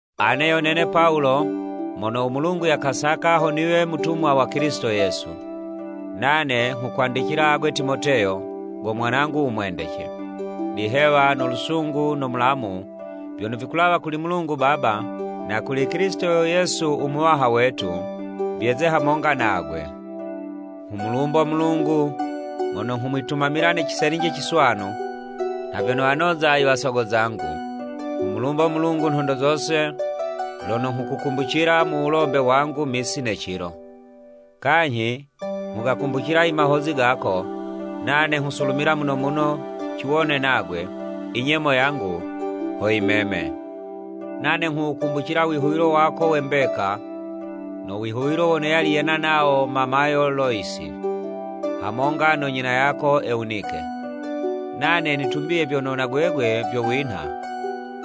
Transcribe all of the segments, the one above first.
Ane yo nene Pawulo, mono u Mulungu yakasaka ho niwe mutumwa wa Kilisito Yesu, nane nghukwandicila agwe Timoteyo, go mwanangu u mwendece. Lihewa, no lusungu no mulamu, vyono vikulawa kuli Mulungu Baba na kuli Kilisito Yesu u Muwaha wetu, vyeze hamonga nagwe. Nghumulumbo Mulungu mono nghumwitumamila ne ciselinji ciswanu, nha vyono wanoza i wasogo zangu, nghumulumbo Mulungu nhondo zose lono nghukukumbucila mu wulombe wangu misi ne cilo. Kanyhi nghugakumbucila i mahozi gako, nane nghusulumila muno muno ciwone nagwe, i nyemo yangu ho yimeme. Nane nghuwukumbucila wihuwilo wako we mbeka, no wihuwilo wono yali yena nawo mamayo Loyisi, hamonga no nyina yako Ewunike. Nane nitumbiye vyono na gwegwe vyo winha.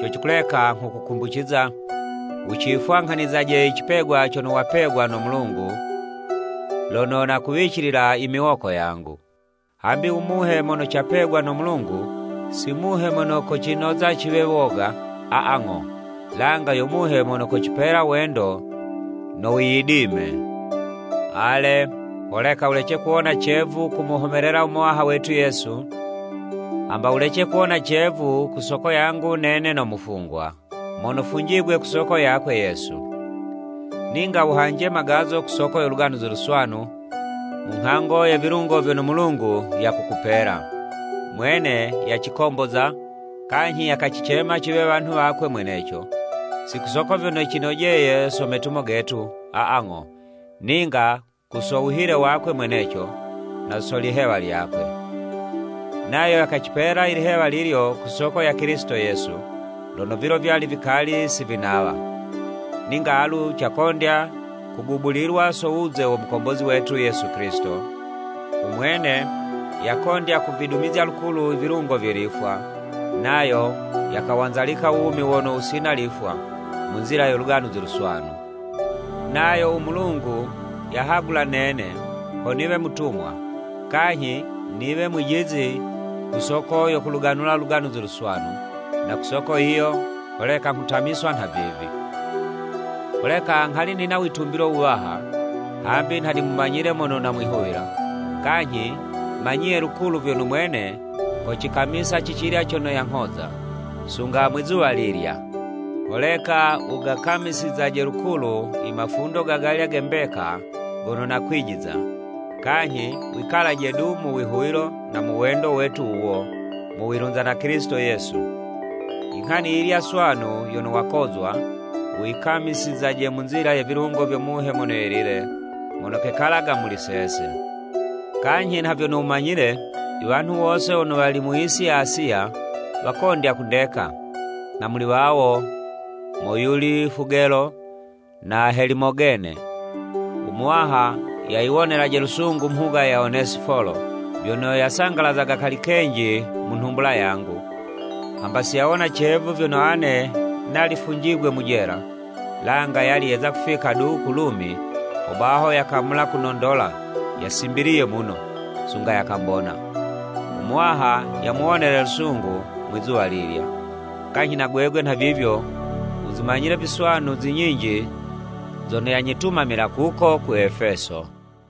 Co cikuleka nghukukumbuciza, wucifwanghanizaje i cipegwa cono wapegwa no Mulungu, lono nakuwicilila i miwoko yangu. Hambi u Muhe mono capegwa no Mulungu, si Muhe mono kocinoza ciwe woga, a, a, ng'o, langa yo Muhe mono kocipela wendo no wiyidime. Ale, holeka wulece kuwona cevu kumuhomelela u Muwaha wetu Yesu, hamba wulece kuwona cevu ku soko yangu nene no mufungwa, mono funjigwe ku soko yakwe, Yesu. Ninga wuhanje magazo ku soko yo Luganuzi Luswanu, mu nghango ye vilungo vyono Mulungu yakukupela. Mwene yacikomboza, kanyhi yakacicema ciwe wanhu wakwe mweneco, si ku soko vyono cinojeye so metumo getu, aa, ng'o, ninga ku so wuhile wakwe mweneco, na so lihewa lyakwe. Nayo yakacipela i lihewa lilyo ku soko ya Kilisito Yesu, lono vilo vyali vikali si vinawa. Ninga alu cakondya kugubulilwa so wuze wo Mukombozi wetu Yesu Kilisito, u mwene yakondya kuvidumizya lukulu i vilungo vye lifwa, nayo yakawanzalika u wumi wono wusina lifwa, mu nzila yo Luganuzi Luswanu. Nayo u Mulungu yahagula nene, ho niwe mutumwa, kanyhi niwe mwijizi ku soko yo kuluganula Luganuzi Luswanu, na ku soko yiyo, holeka nghutamiswa nhavivi. Holeka nghali nina witumbilo wuwaha, hambi nha nimumanyile mono namwihuwila, kanyhi manyiye lukulu vyono mwene kocikamisa cicilya cono yanghoza, sunga Mwizuwa lilya. Holeka wugakamisizaje lukulu i mafundo gagalya ge mbeka gono nakwijiza, kanyhi wikalaje du mu wihuwilo na mu wendo wetu wuwo, mu wilunza na Kilisito Yesu. Inghani yiyilya swanu yono wakozwa, wuyikamisizaje mu nzila ye vilungo vyo Muhe Mono Yelile, mono kekalaga muli sese. Kanyhi nha vyono wumanyile, i wanhu wose wono wali mu yisi ya Asiya, wakondya kundeka, na muli wawo, moyuli Fugelo na Helimogene. U Muwaha yayiwonelaje lusungu mhuga ya Onesifolo, vyono yasangalazaga kali kenji mu nhumbula yangu, hamba si yawona cevu vyono ane nali funjigwe mu jela, langa yali yeza kufika du ku Lumi, hobaho yakamula kunondola yasimbiliye muno, sunga yakambona. U Muwaha yamuwonele lusungu Mwi'zuwa lilya! Kanyhi na gwegwe nhavivyo, wuzimanyile viswanu zi nyinji zono yanyitumamila kuko ku Efeso.